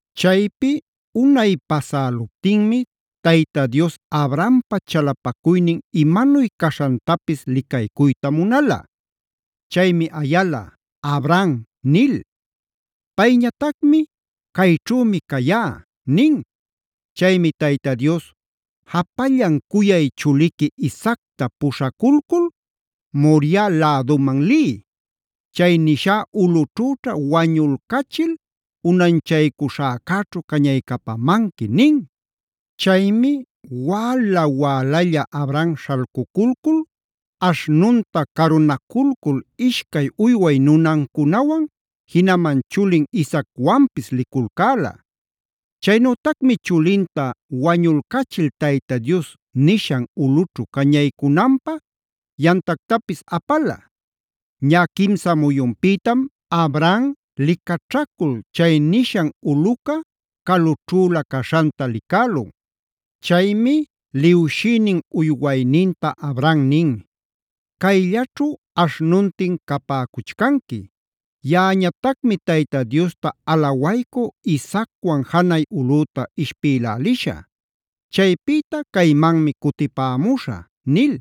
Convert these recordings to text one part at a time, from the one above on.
Chaypi unay pasäluptinmi Tayta Dios Abrahampa chalapacuynin imanuy caśhantapis licaycuyta munala. Chaymi ayala: “Abraham” nil. Payñatacmi: “Cayćhümi cayá” nin. Chaymi Tayta Dios: “Japallan cuyay chuliqui Isaacta puśhaculcul Moriah läduman liy. Chay nishá ulꞌućhüćha wañulcachil unanchaycuśhäcäćhu cañaycapamanqui” nin. Chaymi wäla wälalla Abraham śhalcuculcul aśhnunta carunaculcul ishcay uyway nunancunawan jinaman chulin Isaacwanpis liculcäla. Chaynütacmi chulinta wañulcachil Tayta Dios nishan ulꞌućhu cañaycunanpä yamtactapis apala. Ñä quimsa muyunpïtam Abraham licaćhacul chay nishan ulꞌuca calućhüla caśhanta licälun. Chaymi liwshïnin uywayninta Abraham nin: “Cayllaćhu aśhnuntin capäcuchcanqui. Yaꞌañatacmi Tayta Diosta alawaycú Isaacwan janay ulꞌüta ishpïlälisha. Chaypïta caymanmi cutipämuśhä” nil.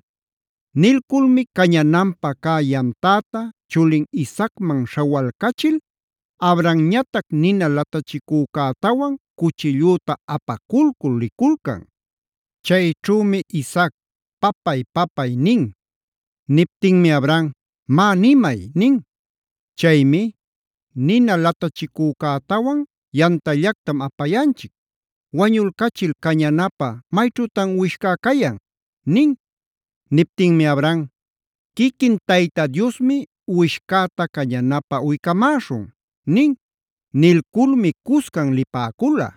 Nilculmi cañananpä cä yamtäta chulin Isaacman śhawalcachil, Abrahamñatac nina latachicücätawan cuchillüta apaculcul liculcan. Chayćhümi Isaac: “Papay, papay” nin. Niptinmi Abraham: “Má, nimay” nin. Chaymi: “Nina latachicücätawan yamtallactam apayanchic, ¿wañulcachil cañanapä mayćhütan uwishcá cayan?” nin. Niptinmi Abraham: “Quiquin Tayta Diosmi uwishcäta cañanapä uycamäśhun” nin. Nilculmi cuscan lipäcula.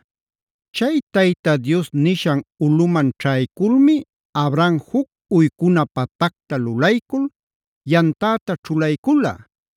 Chay Tayta Dios nishan ulꞌuman ćhayculmi Abraham juc uycuna patacta lulaycul yamtäta ćhulaycula.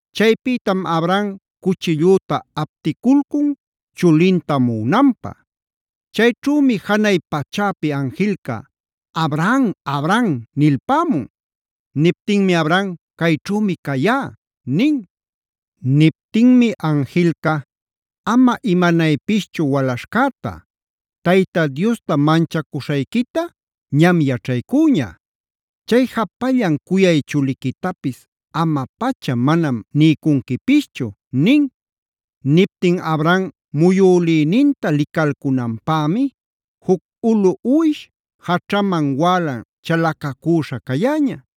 Chaypïtam Abraham cuchillüta apticulcun chulinta muꞌunanpä. Chayćhümi janay pachäpi anjilca: “Abraham, Abraham” nilpämun. Niptinmi Abraham: “Cayćhümi cayá” nin. Niptinmi anjilca: “Ama imanaypischu walaśhcäta. Tayta Diosta manchacuśhayquita ñam yaćhaycüña. Chay japallan cuyay chuliquitapis ama-pacha manam niycunquipischu” nin. Niptin Abraham muyülïninta licalcunanpämi juc ulu uwish jaćhaman wälan chalacacüśha cayäña.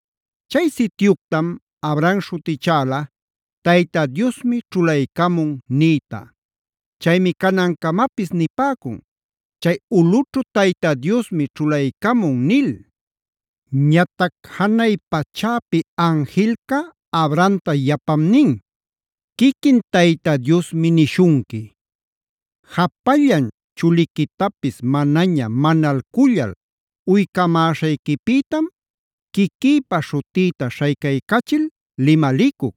Chay sityuctam Abraham śhutichäla “Tayta Diosmi ćhulaycamun” nïta. Chaymi canancamapis nipäcun “Chay ulꞌućhu Tayta Diosmi ćhulaycamun” nil. Ñatac janay pachäpi anjilca Abrahamta yapam nin: “Quiquin Tayta Diosmi nishunqui: Japallan chuliquitapis manaña manalcullal uycamäśhayquipïtam, quiquïpa śhutïta śhaycaycachil limalicuc: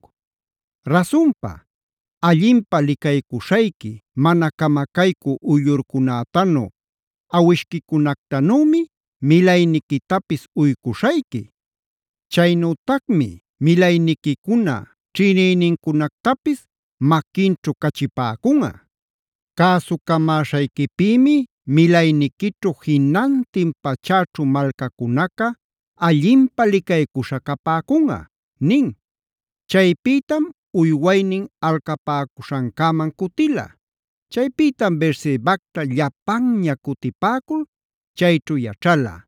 Rasunpa, allinpä licaycuśhayqui, mana camacaycü uyllurcunätanu, awishquicunactanümi milayniquitapis uycuśhayqui.c Chaynütacmi milayniquicuna ćhïnïnincunactapis maquinćhu cachipäcunꞌa. Cäsucamäśhayquipïmi milayniquićhu jinantin pachäćhu malcacunaca allinpä licaycuśhäd capäcunꞌa” nin. Chaypïtam uywaynin alcapäcuśhancäman cutila. Chaypïtam Beersebacta llapanña cutipäcul, chayćhu yaćhala.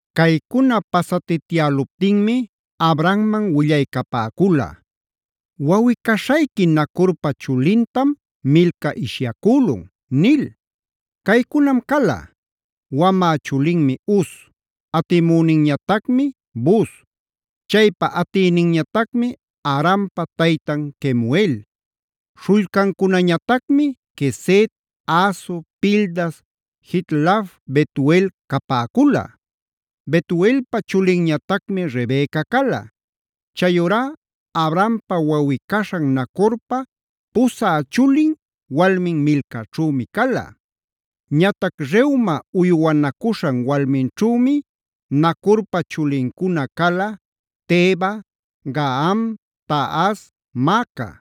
Caycuna pasatityäluptinmi Abrahamman willaycapäcula: “Wawꞌi-caśhayqui Nacorpa chulintam Milca ishyacülun” nil. Caycunam cala: Wamä chulinmi Uz, atimüninñatacmi Buz, chaypa atïninñatacmi Arampa taytan Kemuel. Śhullcancunañatacmi Quesed, Hazo, Pildas, Jidlaf, Betuel capäcula. Betuelpa chulinñatacmi Rebeca cala. Chayurá Abrahampa wawꞌi-caśhan Nacorpa pusä chulin walmin Milcaćhümi cala. Ñatac Reuma uywanacuśhan walminćhümi Nacorpa chulincuna cala: Teba, Gaham, Tahas, Maaca.